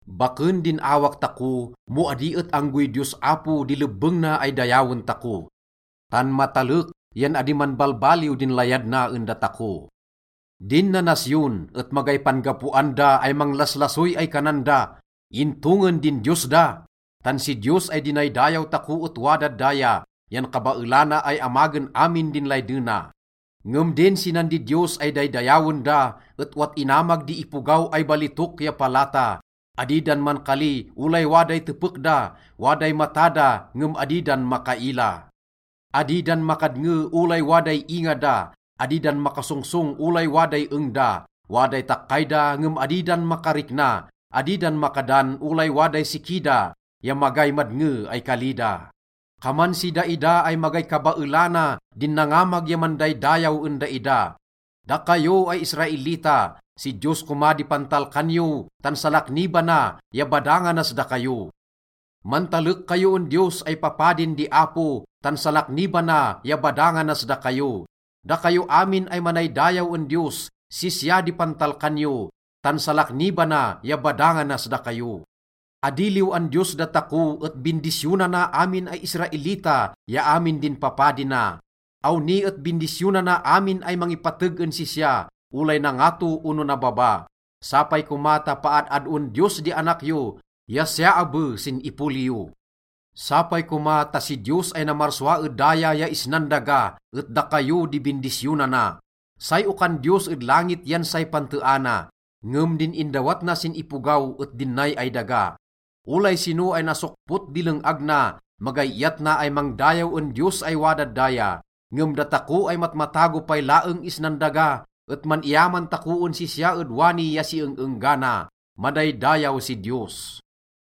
Baken din awak tako mo adi et anggoy Diyos Apo di lebbeng na ay dayawen tako, tan matalek yan adi manbalbaliw din layad na en datako. Din nanasyon et magay pan-gapoan da ay manglaslasoy ay kanan da, “Into ngin din Diyos da?” Tan si Diyos ay dinaydayaw tako et wadad daya, yan kabaelana ay amagen amin din laydena. Ngem din sinan didiyos ay daydayawen da et owat inamag di ipogaw ay balitok ya palata. Adi dan mankali olay waday tepek da, waday mata da ngem adi dan makaila. Adi dan makadnge olay waday inga da, adi da makasongsong olay waday eng da. Waday takkay da ngem adi dan makarikna. Adi dan makadan olay waday siki da, ya magay madnge ay kali da. Kaman si daida ay magay kabaelana din nangamag ya mandaydayaw en daida. Dakayo ay Israelita, si Diyos koma di pantalkan yo, tan salaknibana ya badanganas dakayo. Mantalek kayo en Diyos ay papadin di Apo, tan salaknibana ya badanganas dakayo. Dakayo amin ay manaydayaw en Diyos, sisya di pantalkan yo, tan salaknibana ya badanganas dakayo. Adi liw-an Diyos datako, et bindisyonana amin ay Israelita ya amin din papadi na. Awni et bindisyonana amin ay mangipateg en sisya, olay nangato ono nababa. Sapay koma ta paad-adoen Diyos di anak yo, ya siya abe sin ipoli yo. Sapay koma ta si Diyos ay namarsua ed daya ya isnan daga et dakayo di bindisyonana. Say okan Diyos ed langit yan say panteana, ngem din indawat na sin ipogaw et din nay ay daga. Olay sino ay nasokpot di leng-ag na, magay iyat na ay mangdayaw en Diyos ay wadad daya. Ngem datako ay matmatago pay laeng isnan daga et man-iyaman tako en sisya ed wani ya si eng-enggana. Madaydayaw si Diyos!